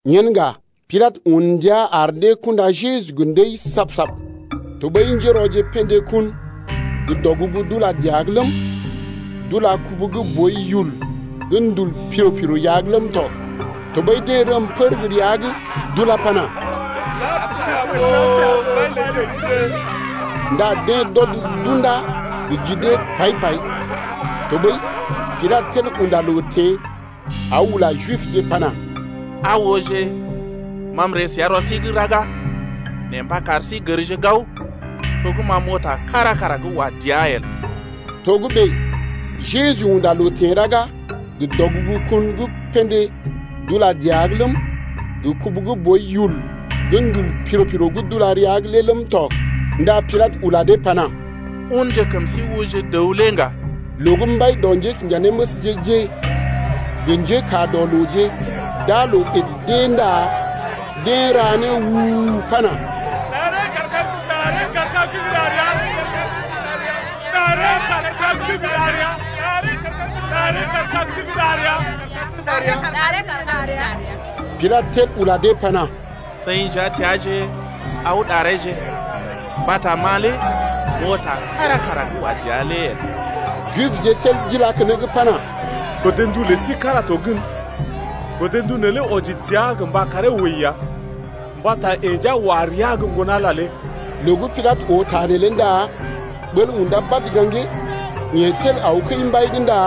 Yen ŋga Pilatə un ndia ar dee kundá Jeju gə ndəi sab-sab. Tɔɓəi njérɔje pḛdé kun gə́ dɔgugu d’ula dəa’g ləm, d’ula kubu gə́ boi yul gə́ ndul piro-piro rəa’g ləm tɔ. Tɔɓəi deḛ rəm pər gə́ rəa’g d’ulá pana: Lapia boo, mbai lə Jibje. Ndá deḛ d’ɔd d’undá gə ji dee paḭ-paḭ. Tɔɓəi Pilatə tel unda loo teḛ aw ula Jibje pana: Aa ooje, ma m’ree səa rɔ sí’g raga nee mba kar sí gərje gao to gə́ ma m’oo ta kára kara gə́ wa dəa el. Togə́bè Jeju unda loo teḛ raga gə dɔgugu kun gə́ pḛdé d’ula dəa’g ləm, gə kubu gə́ boi yul gə́ ndul piro-piro gə́ d’ula rəa’g lé ləm tɔ. Ndá Pilatə ula dee pana: Unje kəm sí ooje dəw lé ŋga. Loo gə́ mbai dɔ njékinjanéməsje-je gə njékaa dɔ looje d’aa loo ɓèd d’ée ndá deḛ ra né u-u-u pana: Ɗaree kaar kag’d gə́ ɗar ya. Ɗaree kaar kag’d gə́ ɗar ya. Pilatə tel ula dee pana: Seḭ nja teaaje aw ɗareeje, mbata ma lé m’oo ta kára kara gə́ wa dəa lé el. Jibje tel d’ilá keneŋ pana: Godndu lə sí kára to gən, godndu neelé wɔji dəa gə mba karee wəi ya, mbata yeḛ nja wa rəa gə Ŋgon-Ala ya. Loo gə́ Pilatə oo ta neelé ndá ɓəl undá badə gaŋgee. Yeḛ tel aw kəi-mbai’g ndá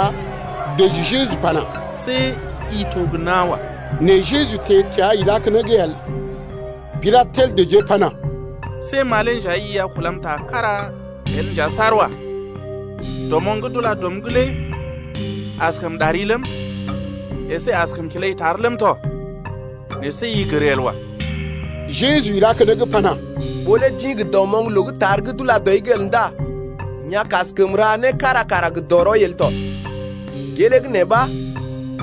dəji Jeju pana: See i to gə́ nawa. Nɛ Jeju teḛ təa ilá keneŋ el. Pilatə tel dəjee pana: See ma lé nja i a kulam ta kára el nja saar wa. Dɔmoŋ gə́ d’ula dɔm’g lé askəm ɗari ləm əsé askəm kilai tar ləm tɔ nɛ see i gər el wa. Jeju ilá keneŋ pana: Ɓó lé d’ḭ gə dɔmoŋ loo gə́ tar’g d’ula dɔi’g el ndá i a kaskəm ra səm né kára kara gə dɔrɔi el tɔ. Gelee gə́ nee ɓa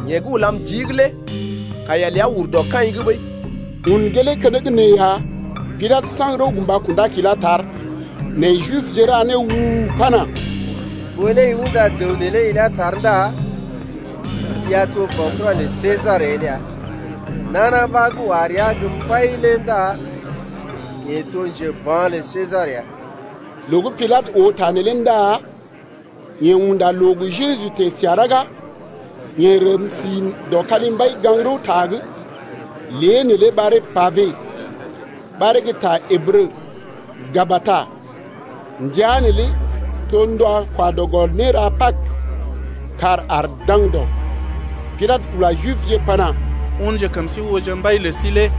yeḛ gə́ ulam jii’g lé kaiya ləa ur dɔ kaḭ’g ɓəi. Un gelee keneŋ nee ya Pilatə saŋg rəw gə mba kundá kilá tar. Nɛ Jibje ra né u-u-u pana: Ɓó lé i unda dəw neelé ilá tar ndá i a to baokura lə Sesar el ya. Nana ɓa gə́ wa rəa gə́ mbai lé ndá yeḛ to njeba̰ lə Sesar ya. Loo gə́ Pilatə oo ta neelé ndá yeḛ unda loo gə Jeju teḛ səa raga, yeḛ rəm si dɔ kalimbai gaŋg-rəwta’g, lé neelé ɓaree Pabe, ɓaree gə ta Ǝbrə Gabata. Ndəa neelé to ndɔ kwa dɔ gɔl néra Pag, kàr aar daŋdɔ. Pilatə ula Jibje pana: Unje kəm sí ooje mbai lə sí lé.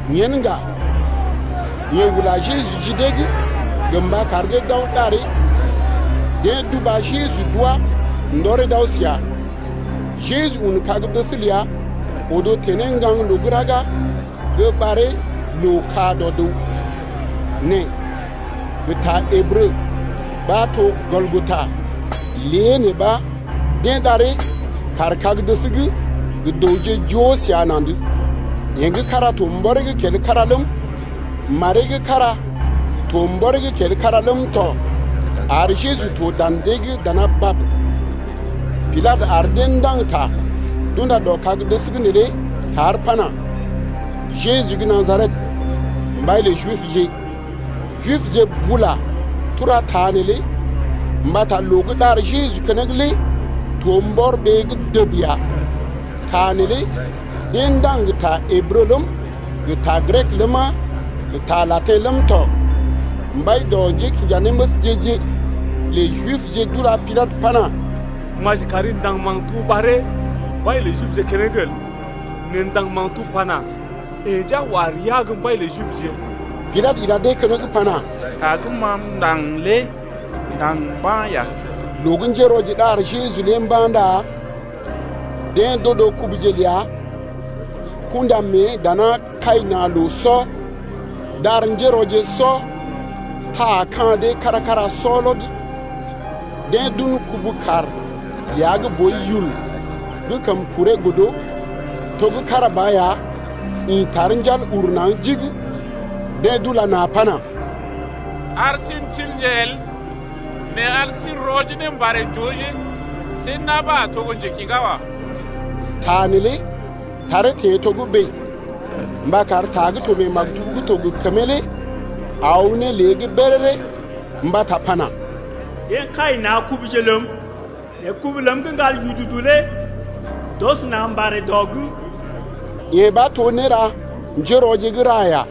Yen ŋga yeḛ ula Jeju ji dee’g gə mba kar dee d’aw ɗaree. Deḛ d’uba Jeju d’wá ndɔree d’aw səa. Jeju un kag-dəs ləa odo teḛ ne ŋgaŋloo gə́ raga gə́ ɓaree Loo-ka-dɔ-dəw, nɛ gə ta Ǝbrə ɓa to Gɔlgota. Lée nee ɓa deḛ ɗaree kaar kag-dəs’g gə dəwje joo səa na̰’d, yeḛ gə́ kára to mbɔree’g kel kára ləm, maree gə́ kára to mbɔree’g kel kára ləm tɔ ar Jeju to dan dee’g dana bab. Pilatə ar dee ndaŋg ta d’unda dɔ kag-dəs’g neelé tar pana: Jeju gə́ Najaret, mbai lə Jibje. Jibje bula tura ta neelé mbata loo gə́ ɗar Jeju keneŋ lé to mbɔr ɓee’g dəb ya. Ta neelé deḛ ndaŋg gə ta Ǝbrə ləm, gə ta Grek ləma, gə ta Latḭ ləm tɔ. Mbai dɔ njékinjanéməsje-je lə Jibje d’ula Pilatə pana: Maji kari ndaŋg maktub ɓaree mbai lə Jibje keneŋ el. Nɛ ndaŋg maktub lé pana: Yeḛ nja wa rəa gə́ mbai lə Jibje. Pilatə ila dee keneŋ pana: Ta gə́ ma m’ndaŋg lé m’ndaŋg mba̰ ya! Loo gə́ njérɔje ɗar Jeju lé mba̰ ndá deḛ d’odo kubuje ləa kunda mée dana kai na̰ loo sɔ, d’ar njérɔje sɔ taa ka̰ dee kára-kára sɔ lɔd. Deḛ d’un kubu-kaar ləa gə́ boi yul gə́ kəm kuree godo, to gə́ kára ba ya ḭ tar njal uru naŋg jigi. Deḛ d’ula na̰ pana: Ar sí n’tilje el, nɛ ar sí n’rɔ ne mbarè j’ooje see na̰ ɓa a to gə́ njekḭgá wa. Ta neelé taree teḛ togə́bè mba kar ta gə́ to mee maktub gə́ to gə kəmee lé aw ne lée’g béréré mbata pana: Deḛ kai na̰ kubuje ləm, Nɛ kubu ləm gə́ ŋgal yududu lé d’ɔs na̰ mbarè dɔ’g. Yee ɓa to néra njérɔje gə́ ra ya.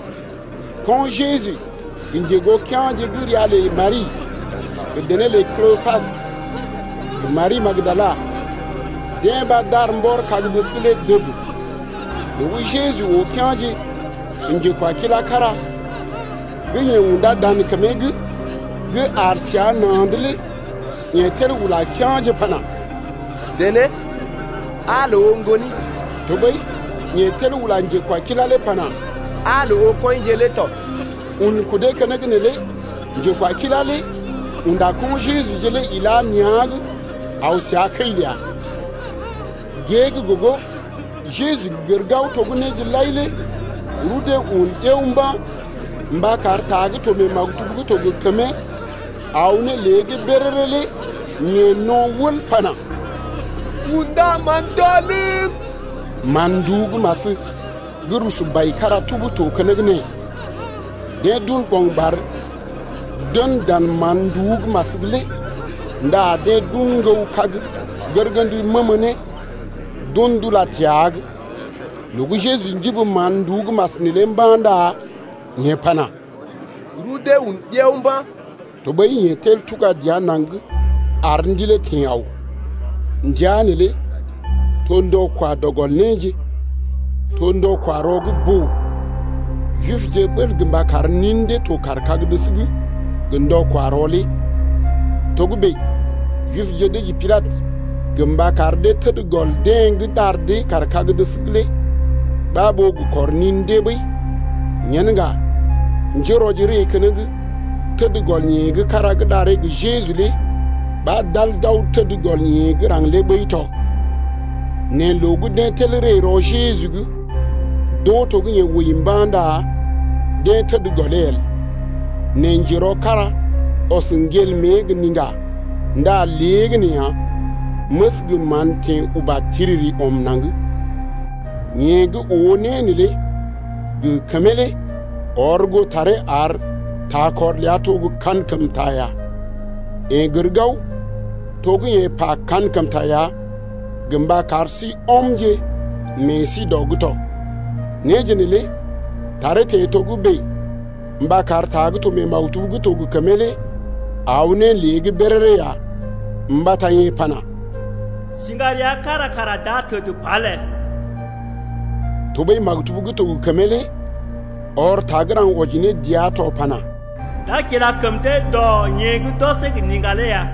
Ko̰ Jeju gə njegoo kea̰je gə́ ria lə Mari gə dené lə Klopas gə Mari gə́ Magdala, deḛ ɓa d’aar mbɔr kag-dəs’g lé dəb. Loo gə́ Jeju oo kea̰je gə njekwakilá kára gə́ yeḛ undá dan kəmee’g gə́ aar səa na̰’d lé yeḛ tel ula kea̰je pana: Dené aa loo oo ŋgoni. Tɔɓəi yeḛ tel ula njekwakilá lé pana: Aa loo oo kɔinje lé tɔ. Un kudee keneŋ neelé njekwakilá lé unda ko̰ Jeju-je lé ilá nea̰’g aw səa kəi ləa. Gée gə́ gogo Jeju gər gao to gə́ néje lai lé rudee un ɗiao mba̰ ndá mba kar ta gə́ to mee maktub gə́ to gə kəmee aw ne lée’g béréré lé yeḛ no̰ wəl pana: Kṵdaman tɔlm. Man-nduú gə́ mas gə́ rusu bai kára tub to keneŋ nee. Deḛ d’un ɓo̰gɓar d’en dan mán-nduú gə́ mas’g lé ndá deḛ d’un ŋgəw kag gərgənd məmə ne d’un d’ula gə́ təa’g. Loo gə́ Jeju njibi mán-nduú gə́ mas neelé mba̰ ndá yeḛ pana: Rudee un ɗiao mba̰. Tɔɓəi yeḛ tel tuga dəa naŋg ar ndilee teḛ aw. Ndəa neelé to ndɔ kwa dɔ gɔl néje, to ndɔ-kwa-rɔ gə́ boo. Jibje ɓəl gə mba kar nin dee to kaar kag-dəs’g gə ndɔ-kwa-rɔ lé. Togə́bè Jibje dəji Pilatə gə mba kar dee təd gɔl deḛ gə́ ɗar dee kaar kag-dəs’g lé ɓa ɓó gə kɔr nin dee ɓəi. Yen ŋga njérɔje ree keneŋ təd gɔl yeḛ gə́ kára gə́ ɗaree gə Jeju lé ɓa d’al d’aw təd gɔl yeḛ gə́ raŋg lé ɓəi tɔ. Nɛ loo gə́ deḛ tel ree rɔ Jeju’g d’oo to gə́ yeḛ wəi mba̰ ndá deḛ təd gɔlee el, nɛ njerɔ kára ɔs ŋgel mée gə niŋga ndá léegəneeya məs gə mán teḛ uba tiriri ɔm naŋg. Yeḛ gə́ oo né neelé gə kəmee lé ɔr goo taree ar takɔr ləa to gə́ kankəmta ya, yeḛ gər gao to gə́ yeḛ pa kankəmta ya gə mba kar sí ɔmje meḛ sí dɔ’g tɔ. Néje neelé taree teḛ togə́bè mba kar ta gə́ to mee maktub gə́ to gə kəmee lé aw ne lée’g béréré ya, mbata yee pana: Siŋga rəa kára kara d’a təd pal el. Tɔɓəi maktub gə́ to gə kəmee lé ɔr ta gə́ raŋg wɔji ne dəa to pana: D’a kila kəm dee gə́ rɔ yeḛ gə́ d’ɔsee gə niŋga lé ya.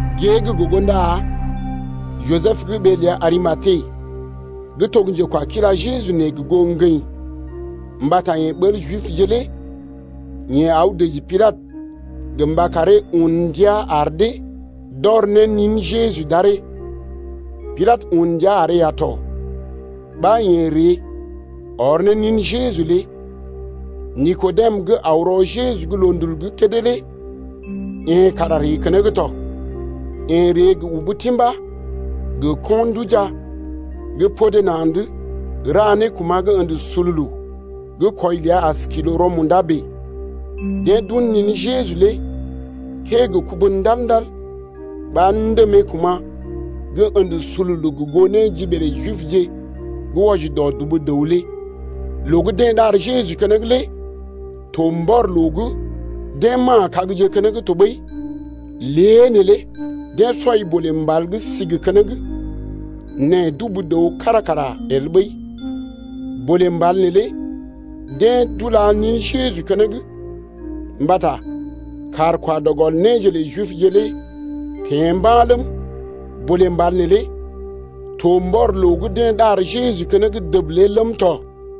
Gée gə́ gogo ndá Jisəb gə́ ɓee ləa Arimate gə́ to njekwakila Jeju nɛ gə goo ŋgəḭ mbata yeḛ ɓəl Jibje lé yeḛ aw dəji Pilatə gə mba karee un ndia ar dee d’ɔr ne nin Jeju d’aree. Pilatə un ndia aree ya tɔ. Ɓa yeḛ ree ɔr ne nin Jeju lé. Nikodem gə́ aw rɔ Jeju’g loondul’g kédé lé yeḛ kara ree keneŋ tɔ. Yeḛ ree gə ubu timbá gə ko̰-nduja gə́ podé na̰’d ra ne kuma̰ gə́ ə̰də sululu gə́ kwɔi ləa as nékwɔji kwɔi-lə-né rɔ-munda bèe. Deḛ d’un nin Jeju lé kəee gə kubu ndal-ndal ɓa ndèmee kuma̰ gə́ ə̰də sululu gə goo néjiɓee lə Jibje gə́ wɔji dɔ dubu dəw lé. Loo gə́ deḛ ɗar Jeju keneŋ lé to mbɔr loo gə́ deḛ ma̰a kagje keneŋ tɔɓəi lée neelé deḛ sɔi bolè mbal gə́ sigi keneŋ, nɛ dubu dəw kára kara el ɓəi. Bolé mbal neelé deḛ d’ula nin Jeju keneŋ, mbata kàr kwa dɔ gɔl néje lə Jibje lé teḛ mba̰ ləm, bolè mbal neelé to mbɔr loo gə́ deḛ ɗar Jeju keneŋ dəb lé ləm tɔ.